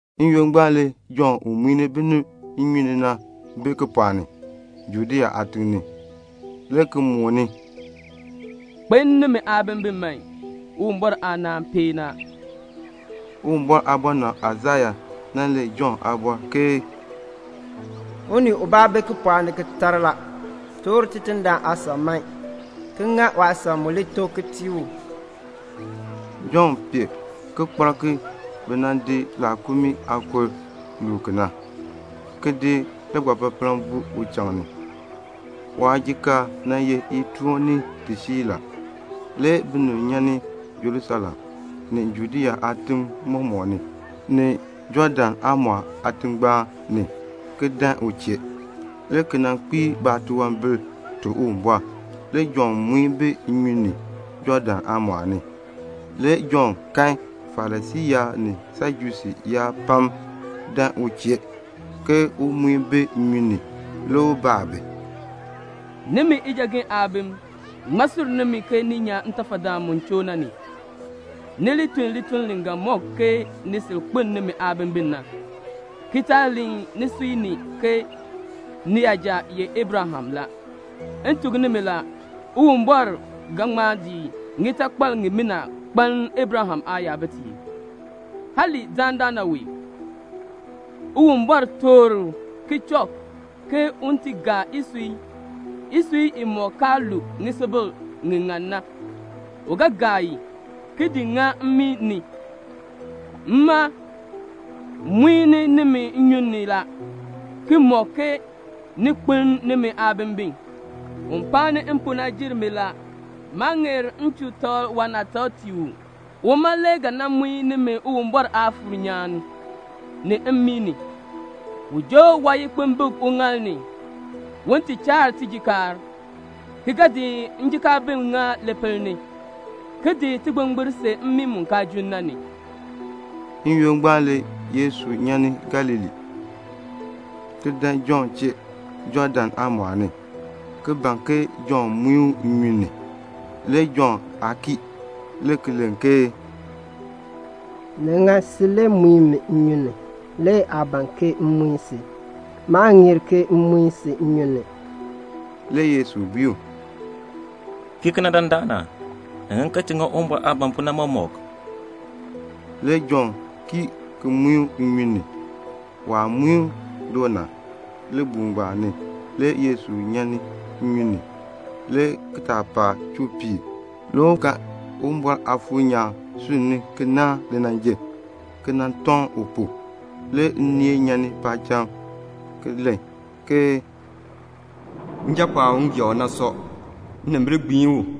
N-yoonn ngbaan le Jɔnn u muin binib nnyun ni na bi kipɔɔk ni, Judea aatiŋ ni, le ki mooni, "Kpeln nimi aabimbin man. Uwumbɔr aanaan peen ni a." Uwumbɔr aabɔnabr Aisaya nan len Jɔnn aabɔr ke "Unii ubaa bi kipɔɔk ni ki tar: 'Toor Tidindaan aasan man ki ŋa waasan mu tok na ki tii u."' Jɔnn pee kikpalk ki bi nan di laakumii aakur ki luu ki na, ki di ligbapapaln ki di buu uchaŋ ni. Waajikaar ye itoon ni tisiir. Le binib nyan ni Jerusalem, ni Judea aatim mɔmɔk ni, ni Jɔɔdan aamɔɔl aatingbaan ni, le ki dan u chee, le ki kpiir baatunwambir ki tuk Uwumbɔr. Le Jɔnn muin bi nnyun ni, Jɔɔdan aamɔɔl ni. Le Jɔnn kan Farisii yaab ni Sajusii yaab pam dan u chee ke un muin bi nnyun ni. Le u baa bi, "Nimi ijagen aabim, ŋmaa sur nimi ke ni li nyan ntafadaan mu choo na ni? Ni li tun lituln li ga mɔk ke ni sil kpeln nimi aabimbin na, ki taa len nisui ni ke niyaja ye Abraham la. M tuk nimi la, Uwumbɔr ga ŋma di ŋitakpal ŋimina ki di kpaln Abraham aayabitiib, hali dandana wee Uwumbɔr toor kichɔk ke un ti gaa isui. Isui imɔk kaa lu ŋisubil ŋi ŋan na, u ga gaa i, ki di ŋa mmii ni. Mma muin nimi nnyun ni la, ki mɔk ke ni kpeln nimi aabimbin. Un paani m pu na jer mi la. Maa ŋeer m chuu takl waanaatak tii u. Uma le ga nan gbiin nimi ngem Uwumbɔr Aafuur nyaan, ki daa nimi ngem aatafal mmii ni. U joo waayikpimbik uŋaal ni, un ti chaar waajikaar, ki ga di njikaabim ki di ŋa lipil ni, ki di tigbingbir ki di see mmii mu kaan junn na ni." N-yoonn ngbaan le Yesu nyan ni Galilee, ki dan Jɔnn chee, Jɔɔdan aamɔɔl ni, ki ban ke Jɔnn muin u nnyun ni. Le Jɔnn aa kii, le ki len ke, "Ni ŋan si le muin mi nnyun ni, le aa ban ke m muin si. Maa ŋeer ke m muin si." Le Yesu bui u, "Kii kena dandana. Ni ŋan ke ti ŋa Uwumbɔr aah ban pu na mɔmɔk." Le Jɔnn kii ki muin u nnyun ni. Waah muin u na, libuul ngbaan ni le Yesu nyan ni nnyun ni. Le kitaapaak chuu piir. Le u kan Uwumbɔr Aafuur nyaan sunni ki naahn linanjil, ki nan tɔŋ u pu. Le nneel nyan ni paacham le ki len, "Njapɔɔn u m gee u na sɔ. Nnimbil gbiin u."